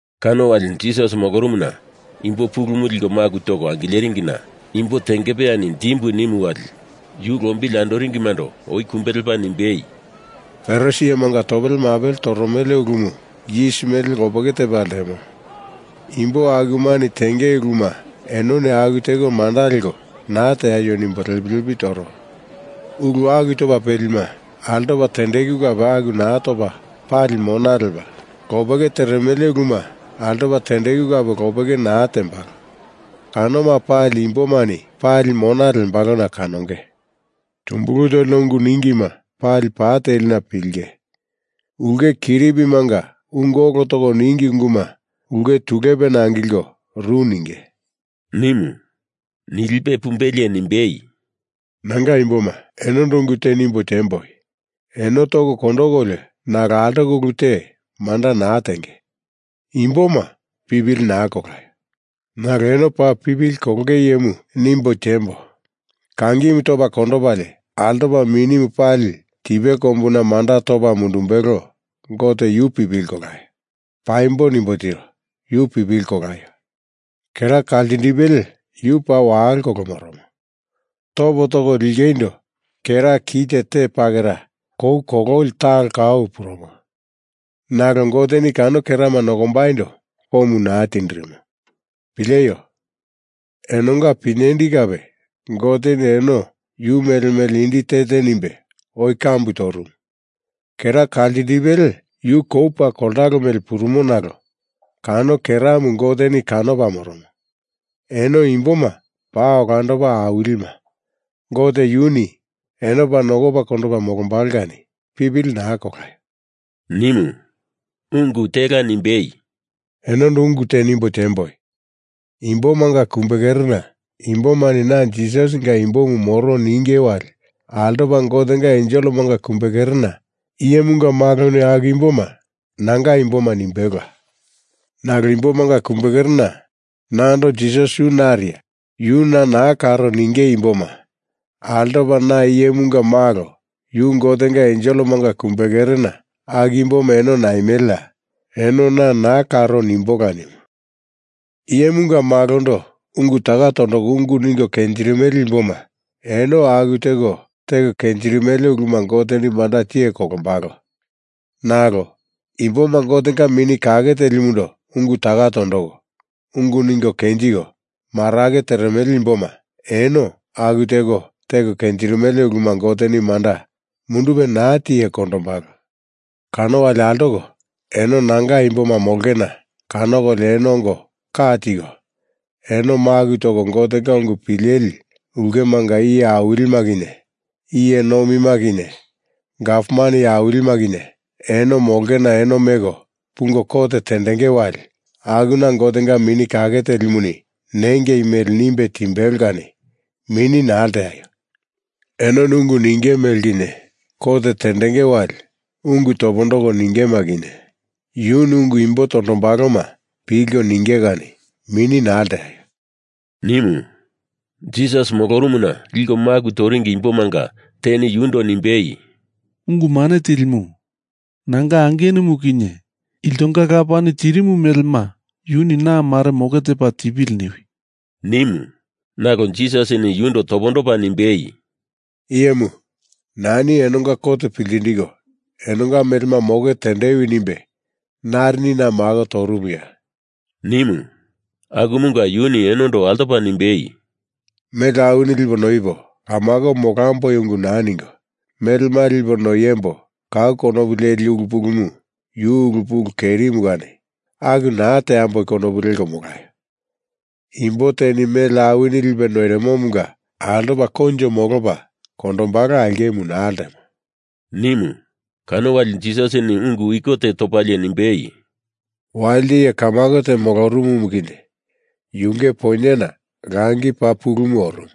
Kano wali Jisas molorumuna imbo pulumu liko maku toko angileringina imbo tengepeyani dimbu nimu wali yu lombili andoringimando oi kumbe lepa nimbei, “Farisi iyemanga topele mapele toromele ulumu yis mele lopeke tepa ltemo. Imbo akumani tenge uluma enoni aku teko manda leko naa teaio nimbo lepi lepi toro. Ulu aku topa pelima altopa tendeku kape aku naa topa pali mona lepa, lopeke teremele uluma altopa tendeku kape lopeke naa tembalo. Kanoma pali imbomani pali mona lembalona kanonge. Tumbulu tolina ungu ningima pali pa telina pilinge. Ulke kiripimanga ungu olo toko ningi unguma ulke tulupena angilko ru ninge,” nimu. Nilipe pumbelie nimbei, “Nanga imboma, enondo ungu te nimbo tiemboi. Eno toko kondokolio nalo altoko ulu te manda naa tenge imboma pipili naa kolaio! Nalo eno paa pipili kolonge iyemu nimbo tiembo. Kangimu topa kondopalie altopa mini pali tipe kombuna manda topa mundumbelo Gote yu pipili kolaio! Paimbo nimbo tiro. Yu pipili kolaio! Kera kaltindipele yu paa walo kolo moromo, topo toko lingeindo kera kite te pakera kou kololi talo kau purumo. Nalo Goteni kano kerama nokombaindo komu naa tindirimo. Pileio! Enonga pinyendi kape Goteni eno yu mele mele indi te te nimbe oi kambu torumu. Kera kaltindipele yu kou paa koltalo mele purumo nalo kano keramu Goteni kanopa moromo. Eno imboma paa olandopa awilima Gote yuni eno paa nokopa kondopa molombalo kani pipili naa kolaio!” nimu. Ungu tela nimbei, “Enondo ungu te nimbo tiemboi. Imbomanga kumbekerena imbomani na Jisasinga imbomu moro ninge wali altopa Gotenga enselemanga kumbekerena Iyemunga Maloni aku imboma, nanga imboma, nimbelola. Nalo imbomanga kumbekerena nando Jisas yu nariya, yu na naa karo ninge imboma altopa na Iyemunga Malo yu Gotenga enselemanga kumbekerena, aku imboma eno naimeleya, eno na naa karo nimbola nimu. Iyemunga Malondo ungu taka tondoko ungu ningo kenjirimele imboma eno aku teko teko kenjirimele uluma Goteni manda tiye kondombalo. Nalo imboma Gotenga Mini Kake Telimundo ungu taka tondoko, ungu ningo kenjiko, marake teremele imboma eno aku teko teko kenjirimele uluma Goteni manda mundupe naa tiye kondombalo. Kano wali altoko eno nanga imboma molongena kanokolio eno ongo ka tiko, eno maku toko Gotenga ungu pileli ulkemanga iye awilima kinye, iye nomima kinye, gavman iye awilima kinye eno molongena eno meko pungo kot tendenge wali akuna Gotenga Mini Kake Telimuni nengei mele nimbe timbelo kani mini naa lteaio! Enoni ungu ninge mele kinye, kot tendenge wali ungu topondoko ningema kinye, yuni ungu imbo tondombaloma pilko ninge kani mini naa lteaio,” nimu. Jisas molorumuna liko maku toringi imbomanga teni yundo nimbei, “Ungu Mane Tilimu, nanga angenumu kinye iltonga lapani tirimu melema yuni na mare moke tepa tipili niwi,” nimu. Nalo Jisasini yundo topondopa nimbei, “Iyemu, Nani enonga kot piltindiko enonga melema moke tendewi nimbe narini na mako torumuya?” nimu. Akumunga yuni enondo altopa nimbei, “Mele awini lipo noipo kamako molamboi ungu naa ningo, melema lipo noiembo kau konopu leli ulu pulumu yu ulu pulu kerimu kani aku naa teambo konopu leko molaio! Imbo teni mele awini lipe noirimomunga altopa koinjo molopa kondombalo aulkemu naa ltemo,” nimu. Kano wali Jisasini ungu iko te topalie nimbei, “Walite iye kamako te molorumu kinye yunge poinyena langi paa pulumu orumu.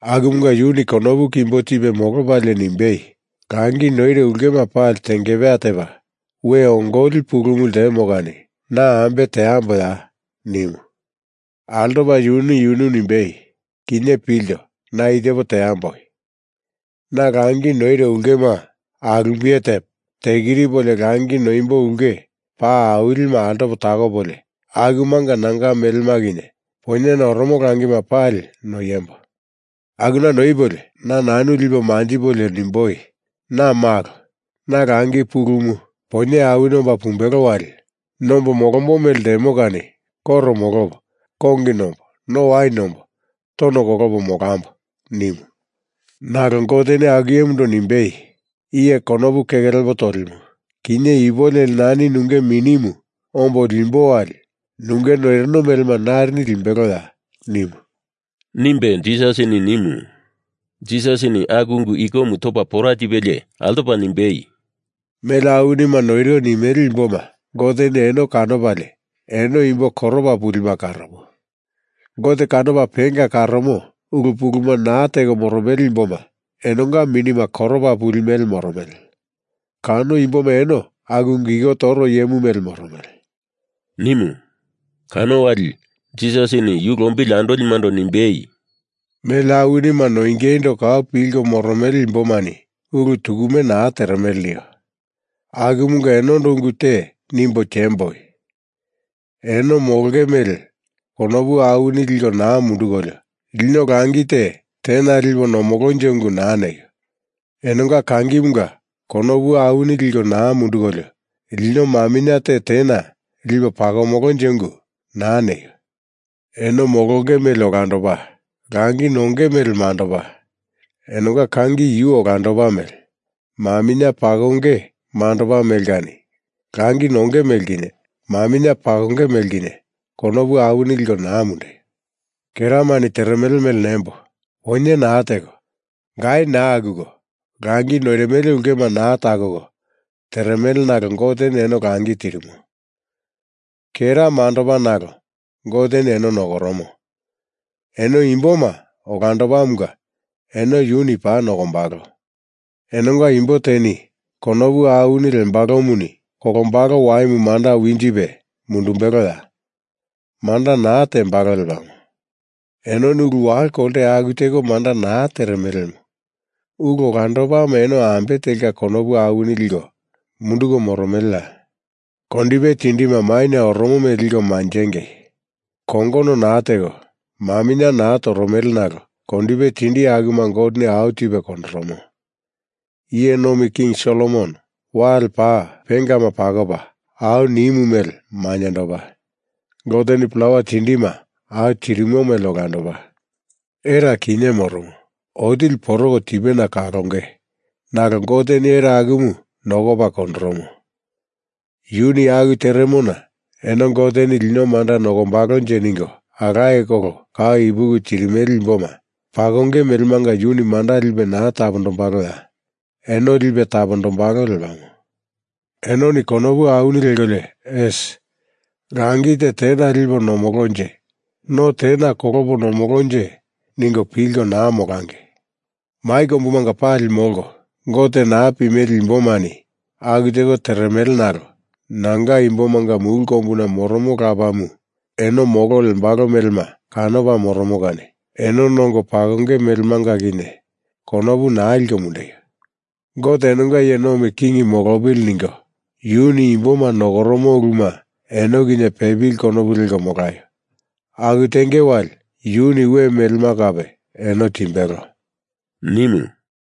Akumunga yuni konopu kimbo tipe molopalie nimbei, ‘Langi noiro ulkema pali tengepeya tepa, we ongoli pulumu ltemo kani na ambe teamboya?’ nimu. Altopa yuni yunu nimbei, ‘Kinye pilto. Na i tepo teamboi. Na langi noiro ulkema alumbiye tepo tekiripolio langi noimbo ulke paa awilima altopo takopolio akumanga nanga melema kinye poinyena oromo langima pali noiembo! Akuna noipolio na nanu lipo manjipolio nimboi, “Na malo. Na langi pulumu, poinye awini omba pumbelo wali nombo molombo mele ltemo kani koro molopo, kongi nombo, no wain nombo, tono kolopo molambo!” ’ nimu. Nalo Goteni aku iyemundo nimbei, ‘Iye konopu keke lepo tolimu, kinye ipu leli nani nunge minimu ombo limbo wali nunge noirino melema narini limbeloya?’ nimu,” nimbe Jisasini nimu. Jisasini aku ungu ikomu topa pora tipelie altopa nimbei, “Mele awinima noiro nimele imboma Goteni eno kanopalie eno imbo koropa pulima karomo. Gote kanopa penga karomo ulu puluma naa teko moromele imboma enonga minima koropa pupili mele moromele. Kano imboma eno aku ungu iko toro iyemu mele moromele,” nimu. Kano wali Jisasini yu lombili andolimando nimbei, “Mele awinima noingeindo kau pilko moromele imbomani ulu tukume naa teremele nio akumunga enondo ungu te nimbo tiemboi. Eno molonge mele konopu awini liko naa mundukolio lino langi te tena lipo nomolonje ungu naa neio! Enonga kangimunga konopu awini liko naa mundukolio lino maminye te tena lipo pakomolonje ungu naa neio! Eno molonge mele olandopa, langi nonge mele mandopa; enonga kangi yu olandopa mele maminye pakonge mandopa mele kani langi nonge mele kinye maminye pakonge mele kinye konopu awini liko naa mundeio! Keramani teremele mele nembo! Poinye naa teko, gai naa akuko langi noirimele ulkema naa takoko teremele nalo Goteni eno langi tirimo. Kera mandopa nalo Goteni eno nokoromo. Eno imboma olandopamunga eno yuni paa nokombalo. Enonga imbo teni konopu awini lembalomuni kolombalo waimu manda winjipe mundumbeloya? Manda naa tembalo lepamo. Enoni ulu walo kolte aku teko manda naa teremelemu ulu olandopama eno ambe telka konopu awini liko munduko moromeleya? Kondipe tindima maina oromo mele liko manjengei. Kongono naa teko, maminye naa toromele nalo kondipe tindi akuma Goteni au tipe kondoromo. Iye Nomi King Solomon wale paa pengama pakopa au nimu mele mainyendopa. Goteni plawa tindima au tirimo mele olandopa. Era, kinye moromo, otili poroko tipena kalonge nalo Goteni era akumu nokopa kondoromo. Yuni aku teremona eno Goteni lino manda nokombalonje ningo alaye kolo kau ipuki tirimele imboma pakonge melemanga yuni manda lipe naa tapondombaloya? Eno lipe tapondombalo lepamo. Enoni konopu awini lekolio asi, langi te tena lipo nomolonje, no tena kolopo nomolonje ningo pilko naa molangei! Mai kombumanga pali molko, Gote naa pimele imbomani aku teko teremele nalo nanga imbomanga mulu kombuna moromo Lapamu eno molo lembalo melema kanopa moromo kani eno nongo pakonge melemanga kinye konopu naa liko mundeio! Gote enonga iye nomi king molopili ningo yuni imboma nokoromo uluma eno kinye pepili konopu leko molaio! Aku tenge wali yuni we melema kape eno timbelo,” nimu.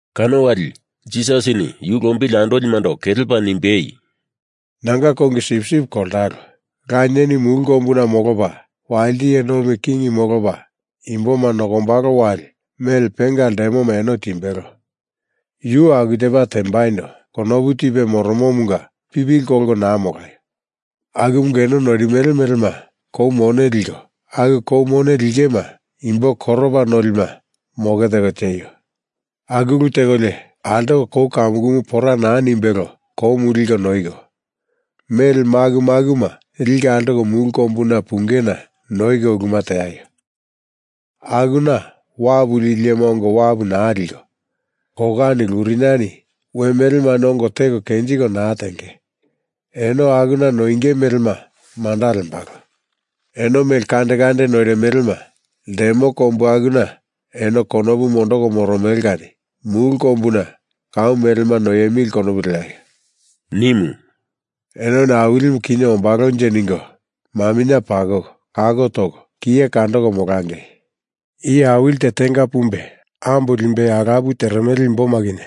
Kano wali Jisasini yu lombili andolimando kelepa nimbei, “Nanga kongi sipsip koltalo, Lanieni mulu kombuna molopa walite iye nomi king molopa imboma nokombalo wali mele penga ltemoma eno timbelo. Yu aku tepa tembaindo konopu tipe moromomunga pipili kolko naa molaio! Akumunga eno noirimele melema kou mone liko aku kou mone lingema imbo koropa nolima moke teko tieio! Aku ulu tekolio altoko kou kamukumu pora naa nimbelo koumu liko noiko, mele maku makuma liko altoko mulu kombuna pungena noiko uluma teaio! Akuna wapu lili iyema ongo wapu naa liko, kokani luriniani we melemani ongo teko kenjiko naa tenge. Eno akuna noinge melema manda lembalo. Eno mele kande kande noirimelema ltemo kombu akuna enoni konopu mondoko moromele kani mulu kombuna kau melema noiemili konopu leaio!” nimu. “Enoni Awilimu kinye ombalonje ningo maminye pakoko, kako toko, kiye kandoko molangei! Iye awili te tenga pumbe ambo limbei alapu teremele imboma kinye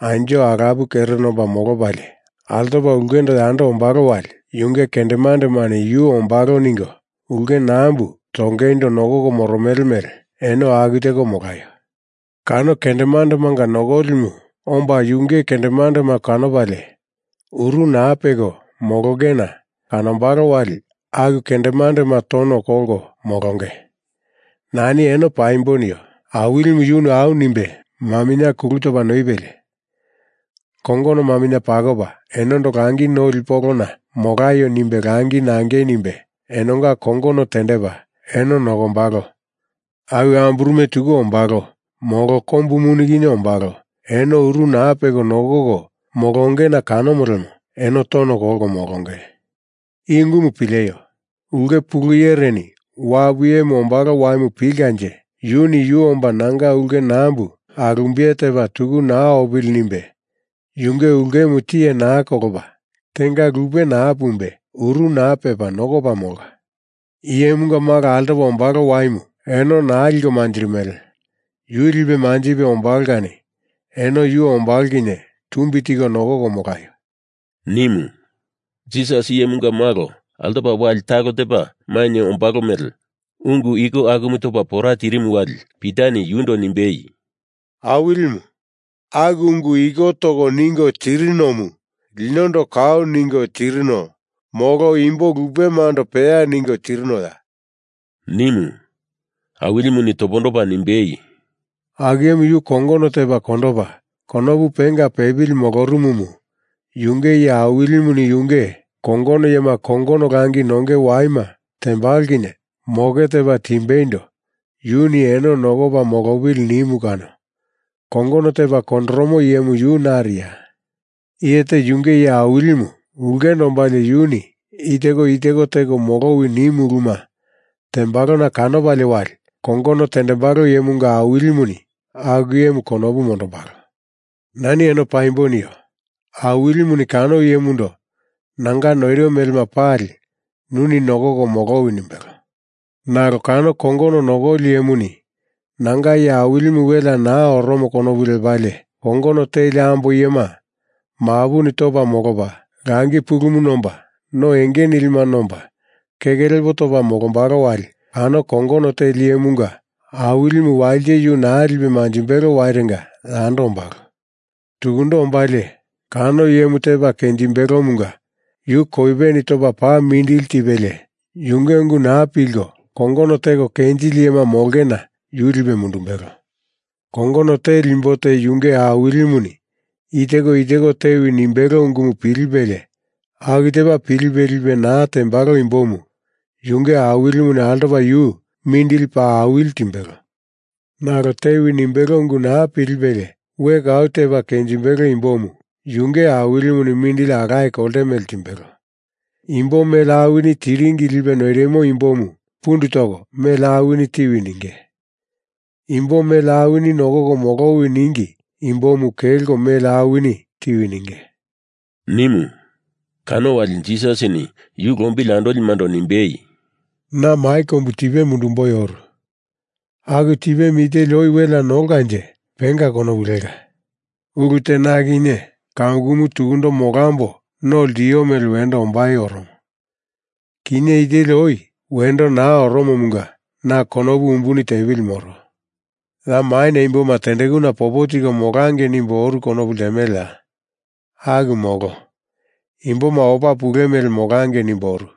anjo alapu kere nomba molopalie altopa ulkendo yando ombalo wali yunge kendemandemani yu ombalo ningo ulke nambu tongeindo nokoko moromele mele, eno aku teko molaio! Kano kendemandemanga nokolimu omba yunge kendemandema kanopalie, uru naa peko molongena kanombalo wali aku kendemandema tono kolko molonge. Nani eno paimbo nio. Awilimu yuni au nimbe maminye kulu topa noipelie kongono maminye pakopa enondo langi noli polona molaio nimbe langi nangei nimbe enonga kongono tendepa eno nokombalo. Awi amburume tuku ombalo, molo kombu muni kinye ombalo, eno uru naa peko nokoko molongena kanomo lemo eno tono kolko molonge. I ungumu pileio! Ulke pulu iyereni wapu iyemu ombalo waimu pilkanje yuni yu omba nanga ulke nambu alumbiye tepa tuku naa opili nimbe yunge ulkemu tiye naa kolopa tenga lupe naa pumbe uru naa pepa nokopa molka. Iyemunga Malo altopa ombalo waimu eno naa liko manjirimele. Yu lipe manjipe ombalo kani eno yu ombalo kinye tumbi tiko nokoko molaio,” nimu. Jisasini Iyemunga Malo altopa wali talo tepa mainye ombalo mele ungu iko akumu topa pora tirimu wali Pitani yundo nimbei, “Awilimu, aku ungu iko toko ningo tirinomu linondo kau ningo tirino molo imbo lupemando peya ningo tirinoya?” nimu. Awilimuni topondopa nimbei, “Aku iyemu yu kongono tepa kondopa konopu penga pepili molorumumu yunge iye awilimuni yunge kongono iyema kongono langi nonge waima tembalo kinye moke tepa timbeindo yuni eno nokopa molopili nimu kano kongono tepa kondoromo iyemu yu nariya? Iye te yunge iye awilimu ulkendo ombalie yuni i teko i teko, teko molowi nimu uluma tembalona kanopalie wali kongono tendembalo iyemunga awilimuni aku iyemu konopu mondombalo. Nani eno paimbo nio. Awilimuni kano iyemundo nanga noiro melema pali nuni nokoko molowi nimbelo. Nalo kano kongono nokoli iyemuni nanga iye awilimu welea naa oromo konopu lepalie kongono teli ambo iyema mapuni topa molopa, langi pulumu nomba no enge nilima nomba keke lepo topa molombalo wali kano kongono teli iyemunga awilimu walite yu naa lipe manjimbelo wairenga yando ombalo. Tukundo ombalie kano iyemu tepa kenjimbelomunga yu koipeni topa paa mindili tipelie, yunge ungu naa pilko kongono teko kenjili iyema molongena yu lipe mundumbelo. Kongono teli imbo te yunge awilimuni i teko i teko tewi nimbelo ungumu pilipelie aku tepa pilipe lipe naa tembalo imbomu yunge awilimuni altopa yu mindili paa awili timbelo. Nalo tewi nimbelo ungu naa pilipelie we kau tepa kenjimbelo imbomu yunge awilimuni mindili alaye kolte mele timbelo. Imbo mele awini tiringi lipe noirimu imbomu pundu toko mele awini tiwi ninge. Imbo mele awini nokoko molowi ningi imbomu kelko mele awini tiwi ninge,” nimu. Kano wali Jisasini yu lombili andolimando nimbei, “Na mai kombu tipe mundumboi oru. Aku tipemu i teli oi welea nolkanje penga konopu leka. Ulu te na kinye kamukumu tukundo molambo no ltio mele wendo ombai oromo. Kinye i teli oi wendo naa oromomunga na konopu umbuni tepili moro. Ya maina imboma tendekuna popo tiko molangei nimbo oru konopu ltemeleya? Aku molo. Imboma opa pule mele molangei nimbo oru.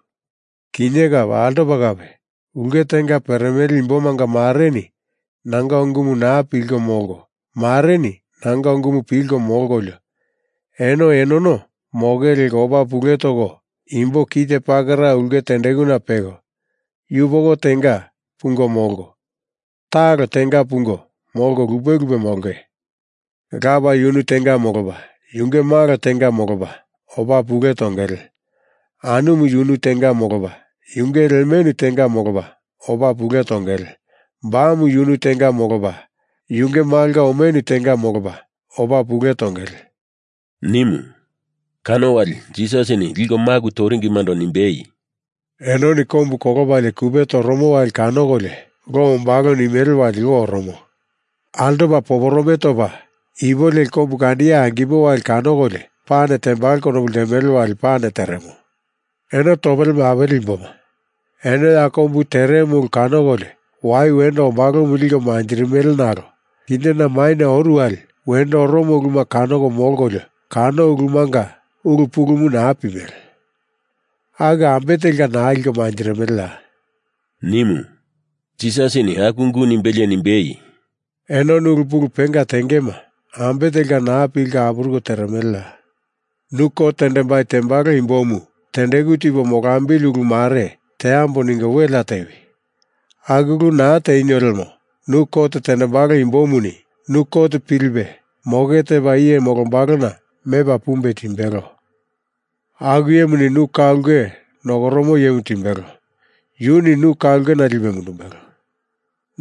Kinye kape altopa kape ulke tenga peremele imbomanga mareni nanga ungumu naa pilko molko mareni nanga ungumu pilko molkolio, eno enono moke leko opa pule toko imbo kite pakera ulke tendekuna peko, yupoko tenga pungo molko, talo tenga pungo molko lupe lupe molonge. Lapa yunu tenga molopa, yunge malo tenga molopa, opa pule tongele. Anumu yunu tenga molopa, yunge lemenu tenga molopa, opa pule tongele. Bamu yunu tenga molopa yunge malonga omenu tenga molopa, opa pule tongele,” nimu. Kano wali Jisasini liko maku toringimando nimbei, “Enoni kombu kolopalie kupe toromu wali kanokolio lo ombalo nimele wali lo oromo. Altopa poporome topa, ipu leli kombu kandiye angimo wali kanokolio pane tembalo konopu ltemele wali pane teremo. Eno topele mapele imboma. Eno ya kombu teremo ulu kanokolio wai wendo ombalomu liko manjirimele nalo kinye na maina oru wali wendo oromo uluma kanoko molkolio kano ulumanga ulu pulumu naa pimele. Aku ambe telka naa liko manjirimeleya?” nimu. Jisasini aku ungu nimbelie nimbei, “Enoni ulu pulu penga tengema ambe telka naa pilko apuruko teremeleya? Nu kot tendembai tembalo imbomu tendeku tipo molambili ulu mare teambo ningo welea tewi! Aku ulu naa tenio lemo nu kot tendembalo imbomu nu kot pilipe moke tepa iye molombalona mepa pumbe timbelo. Aku iyemuni nu ka ulke nokoromo iyemu timbelo, yuni nu ka ulkena lipe mundumbelo.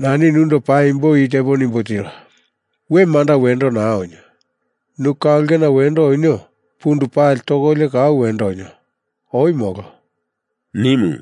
Nani nundo paimbo i tepo nimbo tiro. We manda wendo naa onio. Nu ka ulkena wendo onio pundu pali tokolio kau wendo onio; oi molo,” nimu.